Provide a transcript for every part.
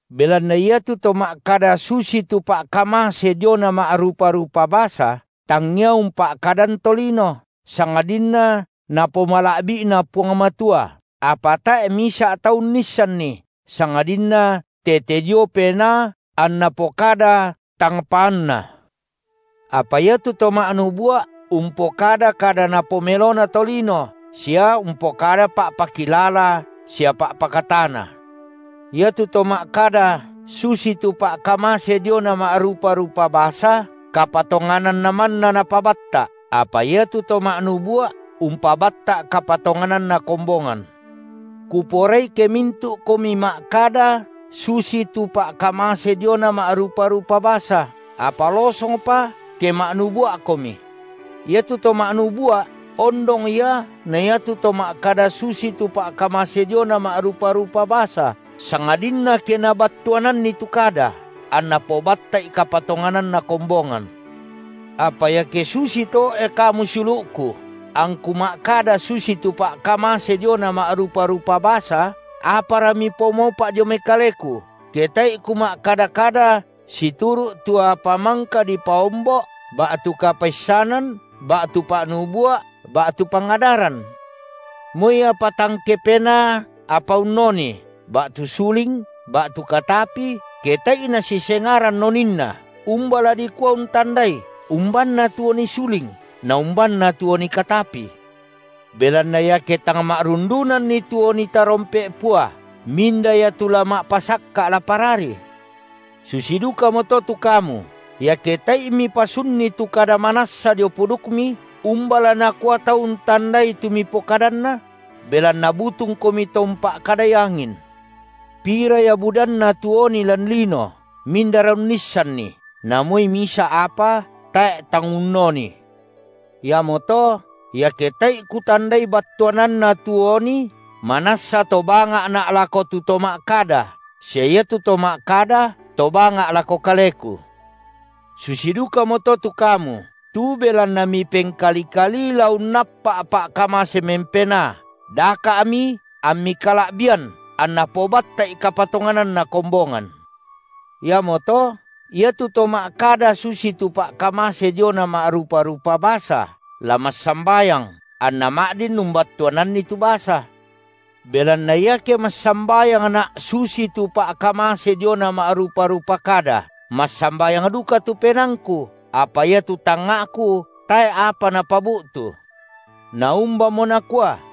Belanna iatu to ma’kada susitu pa’kamase diona ma’rupa-rupa basa, tangia umpa’kadan tolino, sangadinna Napomala’bi’na Puang Matua, apa tae’ misa’ tau unnissanni, sangadinna tete dio Penaa anna pokada tang paanna. Apa iatu to ma’nubua’, umpokada kada napomelona tolino, sia umpokada pa’pakilala sia pa’pakatana. Iatu to ma’kada susitu pa’kamase diona ma’rupa-rupa basa, kapatongananna manna napabatta’, apa iatu to ma’nubua’ umpabatta’ kapatongananna kombongan. Kuporai ke mintu’komi ma’kada susitu pa’kamase diona ma’rupa-rupa basa, apa losongpa, ke ma’nubua’komi. Iatu to ma’nubua’ ondong ia na iatu to ma’kada susitu pa’kamase diona ma’rupa-rupa basa, sangadinna ke nabattuananni tu kada, anna pobatta’i kapatongananna kombongan. Apa iake susito, e kamu siulu’ku, angku ma’kada susitu pa’kamase diona ma’rupa-rupa basa, apara mipomaupa’ dio mai kaleku, ke tae’i kuma’kada-kada situru’ tu apa mangka dipaombo’ ba’tu kapaissanan ba’tu pa’nubua’ ba’tu pangadaran? Moi apa tang kepenaa apa unnoni, ba’tu suling ba’tu katapi, ke tae’i nasisengaran oninna, umba la dikua untandai, umbanna tu oni suling, naumbanna tu oni katapi? Belanna iake tang ma’rundunanni tu oni tarompe’ pua, minda ia tu la ma’pasakka’ la parari? Susi dukamoto tu kamu, iake tae’i mipasunni tu kada manassa dio pudukmi, umba la nakua tau untandai, tu mipokadanna? Belanna butungkomi to umpa’kadai angin. Pira ia budanna tu oni lan lino, mindara unnissanni, na moi misa’ apa tae’ tang unnoni. Iamoto, iake tae’i kutandai battuananna tu oni manassa to banga’na’ lako tu to ma’kada, sia iatu to ma’kada to banga’ lako kaleku. Susi dukamoto tu kamu, tu belanna mipengkali-kalii la unnappa’ pa’kamase mempenaa, daka’mi ammi kala’bian anna pobatta’i kapatongananna kombongan. Iamoto, iatu to ma’kada susitu pa’kamase diona ma’rupa-rupa basa, la massambayang, anna ma’din umbattuananni tu basa. Belanna iake massambayangna’ susitu pa’kamase diona ma’rupa-rupa kada, massambayang duka tu penaangku, apa iatu tangnga’ku tae’ apa napabu’tu. Naumbamo nakua?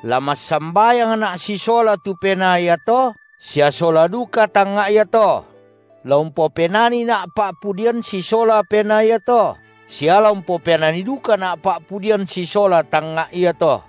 La massambayangna’ sisola tu penaa iato, sia sola duka tangnga’ iato; la umpopenanina’ pa’pudian sisola penaa iato, sia la umpopenani dukana’ pa’pudian sisola tangnga’ iato.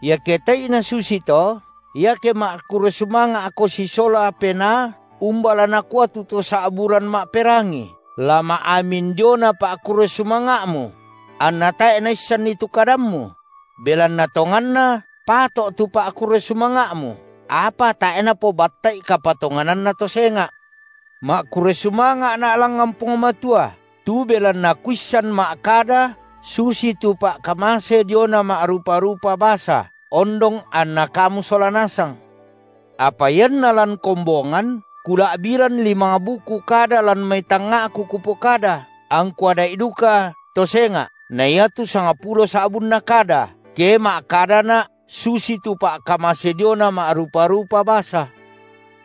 Iake tae’i nasusito, iake ma’kurre sumanga’ko sisola penaa umba la nakua tu to sa’buran ma’perangi, la ma’amin diona pa’kurre sumanga’ mu? Anna tae’ naissanni tu kadammu? Belanna tonganna pato’ tu pa’kurre sumanga’mu, apa tae’ napobatta’i kapatongananna to senga’. Ma’kurre sumanga’na’ langngan Puang Matua, tu belanna kuissan ma’kada susitu pa’kamase diona ma’rupa-rupa basa, ondong anna kamu sola nasang. Apa ianna lan kombongan kula’biran limang buku kada lan mai tangnga’ku kupokada, angku ada’i dukato senga’, na iatu sangpulo sa’bunna kada, ke ma’kadana’ susitu pa’kamase diona ma’rupa-rupa basa.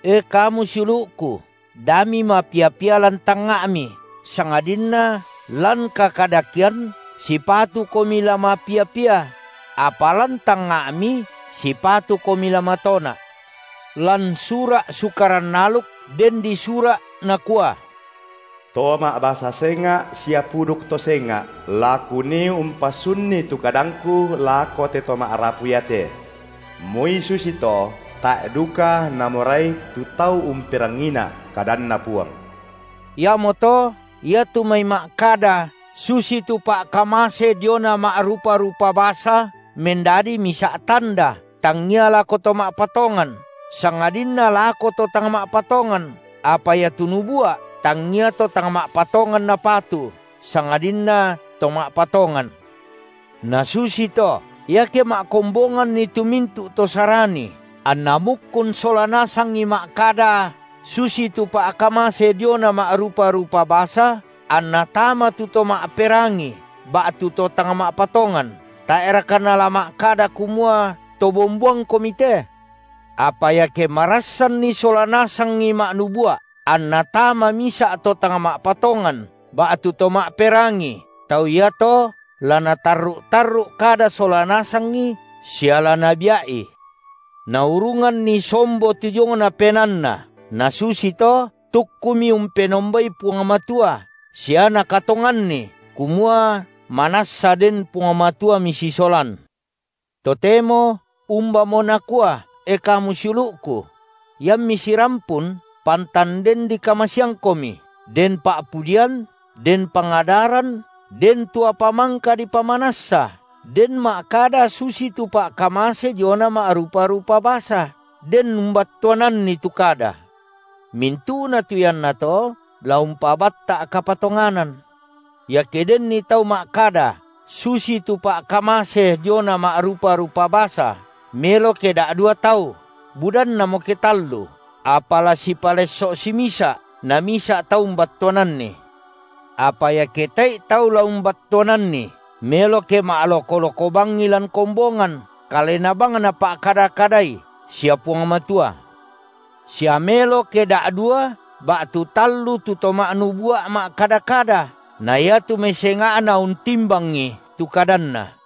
E, kamu siulu’ku, da mimapia-pia lan tangnga’mi, sangadinna lan kakadakean sipatukomi la mapia-pia; apa lan tangnga’mi sipatukomi la matona’. Lan sura’ Sukaran aluk den disura’, nakua: To ma’basa senga’ sia puduk to senga’ la Kunii umpasunni tu kadangKu lako te to ma’rapu iate. Moi susito tae’ duka namorai tu tau umperangiiNa’, kadanNa Puang. Iamoto iatu mai ma’kada susitu pa’kamase diona ma’rupa-rupa basa mendadi misa’ tanda, tangngia lako to ma’patongan, sangadinna lako to tang ma’patongan, apa iatu nubua’, tangngia to tang ma’patongan napatu, sangadinna to ma’patongan. Nasusito, iake ma’kombonganni tu mintu’ to Sarani, anna mukkun sola nasangi ma’kada susitu pa’kamase diona ma’rupa-rupa basa, anna tama tu to ma’perangi ba’tu to tang ma’patongan, tae’raka nala ma’kada kumua to bomboangkomi te? Apa iake marassanni sola nasangi ma’nubua’, anna tama misa’ to tang ma’patongan, ba’tu to ma’perangi, tau iato la natarru’-tarru’ kada sola nasangi sia la nabia’i, naurunganni sombo tu diongna penaanna, nasusito tukkumi umpenombai Puang Matua sia nakatonganni kumua, manassa den Puang Matua misisolan. Totemo umbamo nakua, e kamu siulu’ku? Iammi sirampun, pantan den dikamaseangkomi, den pa’pudian, den pangadaran, den tu apa mangka dipamanassa, den ma’kada susitu pa’kamase diona ma’rupa-rupa basa, den umbattuananni tu kada. Mintu’na tu iannato la umpabatta’ kapatonganan. Iake denni tau ma’kada susitu pa’kamase diona ma’rupa-rupa basa, melo ke da’dua tau, budannamo ke tallu, apa la sipalesso’ simisa’, namisa’ tau umbattuananni. Apa iake tae’i tau la umbattuananni, melo ke ma’loko-loko bangi lan kombongan, kalena bang napa’kada-kadai sia Puang Matua. Sia melo ke da’dua ba’tu tallu tu to ma’nubua’ ma’kada-kada, na iatu mai senga’na untimbangi tu kadanna.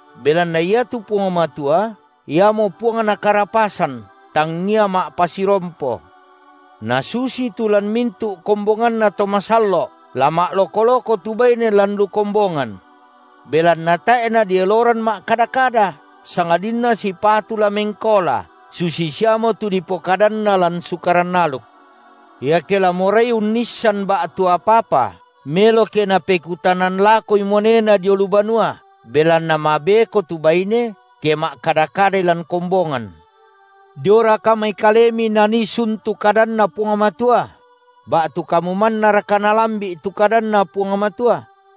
belanna iatu Puang Matua Iamo Puangna karapasan, tangngia ma’pasirompo. Nasusitu lan mintu’ kombonganna to masallo’, la ma’loko-loko tu baine lan lu kombongan. Belanna tae’ nadieloran ma’kada-kada, sangadinna sipatu la mengkaola, susi siamo tu dipokadanna lan Sukaran aluk. Iake la morai unnissan ba’tu apa-apa, melo ke napekutanan lakoi muanena dio lu banua, belanna mabeko tu baine, ke ma’kada-kadai lan kombongan. Dioraka mai kalemi nanii sun tu kadanNa Puang Matua? Ba’tu kamu mannaraka nalambi’ tu kadanNa Puang Matua?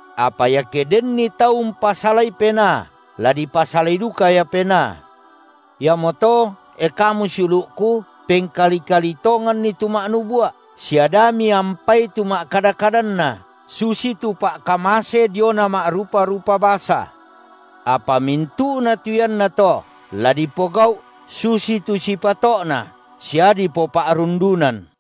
Apa iake denni tau umpasalai penaa, la dipasalai duka ia penaa. Iamoto, e kamu siulu’ku, pengkali-kalii tonganni tu ma’nubua’, sia da miampai tu ma’kada-kadanna, susitu pa’kamase diona ma’rupa-rupa basa. Apa mintu’na tu iannato la dipogau’ susitu sipato’na sia dipopa’rundunan.